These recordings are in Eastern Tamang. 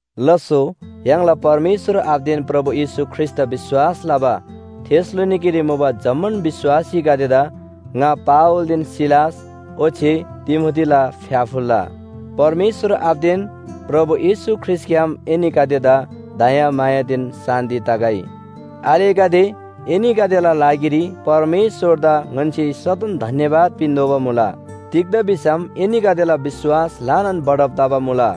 लास्‍सो य्‍हाङला परमेश्‍वर आबादेन प्रभु येशू ख्रीष्‍टदा विश्‍वास लबा थेसलोनिकेरी मुबा जम्‍मान विश्‍वासीगदेदा ङा पावलदेन सिलास ओच्‍छे तिमोथीला फ्‍याफुल्‍ला! परमेश्‍वर आबादेन प्रभु येशू ख्रीष्‍टग्‍याम एनीगदेदा दयामायादेन शान्‍ति तगै। आलेगदे, एनीगदेला लागिरी परमेश्‍वरदा ङन्‍से सदन धन्‍यवाद पिन्‍तोःबा मुला। तिग्‍दा भिसम एनीगदेला विश्‍वास ल्‍हानान बढब तबा मुला,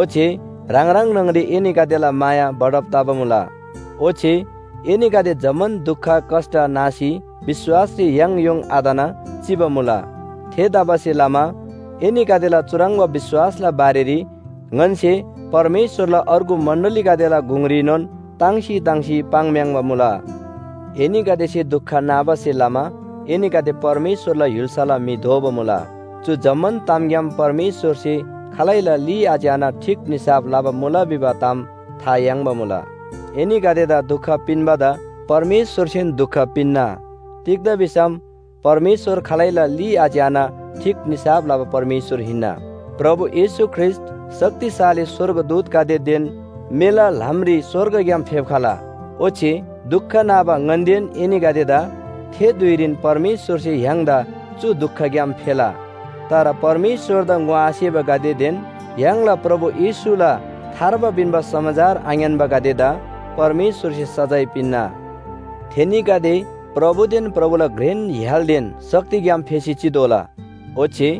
ओच्‍छे ह्राङ ह्राङ न्‍हङरी एनीगदेला माया बढब तबा मुला। ओच्‍छे एनीगदे जम्‍मान दुख कष्‍ट नासी विश्‍वासरी याङयोङ आतना चिबा मुला। थेतबासेलमा एनीगदेला चुह्रङ्बा विश्‍वासला बारेरी ङन्‍से परमेश्‍वरला अर्गु मण्‍डलीगदेला गुङरीनोन ताङ्सी ताङ्सी पाङ्म्‍याङ्बा मुला। एनीगदेसे दुख नाबासे लमा एनीगदे परमेश्‍वरला य्‍हुल्‍साला म्‍हि दोबा मुला। चु जम्‍मान तामग्‍याम परमेश्‍वरसे खालैला ली आच्‍याना ठीक निसाफ लबा मुला भिबा ताम था याङ्बा मुला। एनीगदेदा दुख पिन्‍बादा परमेश्‍वरसेन दुख पिन्‍ना, तिग्‍दा भिसम परमेश्‍वर खालैला ली आच्‍याना ठीक निसाफ लबा परमेश्‍वर हिन्‍ना। प्रभु येशू ख्रीष्‍ट शक्तिशाली स्‍वर्गदूतगदेदेन मेला ल्‍हामरी स्‍वर्गग्‍याम फेप्‍खला। ओच्‍छे दुख नाबा ङन्‍देन एनीगदेदा थे धुइरीन परमेश्‍वरसे य्‍हाङदा चु दुखग्‍याम फेला। तर परमेश्‍वरदा ङोआसेबागदेदेन य्‍हाङला प्रभु येशूला थार्बा पिन्‍बा समाचार आङ्‌यान्‍बागदेदा परमेश्‍वरसे सजाय पिन्‍ना। थेनीगदे प्रभुदेन प्रभुला घ्रेन य्‍हालदेन शक्तिग्‍याम फेसी चितोःला। ओच्‍छे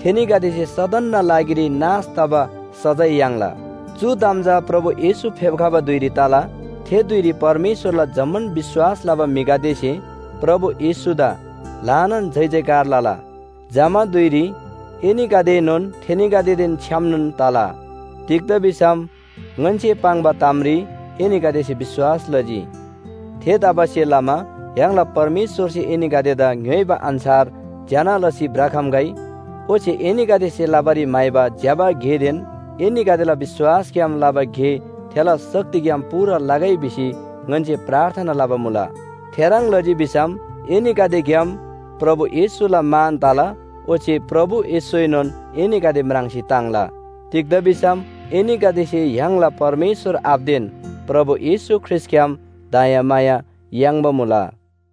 थेनीगदेसे सदनना लागिरी नाश तबा सजाय याङ्ला। चु ताम चा प्रभु येशू फेप्‍खबा धुइरी तला। थे धुइरी परमेश्‍वरला जम्‍मान विश्‍वास लबा म्‍हिगदेसे प्रभु येशूदा ल्‍हानान जयजयकार लला। जमा धुइरी एनीगदेएनोन थेनीगदेदेन छ्‌यामनोन तला, तिग्‍दा भिसम ङन्‍से पाङ्बा तामरी एनीगदेसे विश्‍वास लजी। थेतबासेलमा य्‍हाङला परमेश्‍वरसे एनीगदेदा ङ्‌योइबा अन्‍छार ज्‍यना लसी भ्रखम्‍गै, ओच्‍छे एनीगदेसे लबारी म्‍हाइबा ज्‍यबा गेदेन एनीगदेला विश्‍वासग्‍याम लबा गे थेला शक्तिग्‍याम पूरा लगै भिसी ङन्‍से प्रार्थना लबा मुला। थेह्रङ् लजी भिसम एनीगदेग्‍याम प्रभु येशूला मान तला ओच्‍छे प्रभु येशूएनोन एनीगदे म्राङ्सी ताङ्ला। तिग्‍दा भिसम एनीगदेसे य्‍हाङला परमेश्‍वर आबादेन प्रभु येशू ख्रीष्‍टग्‍याम दयामाया याङ्बा मुला।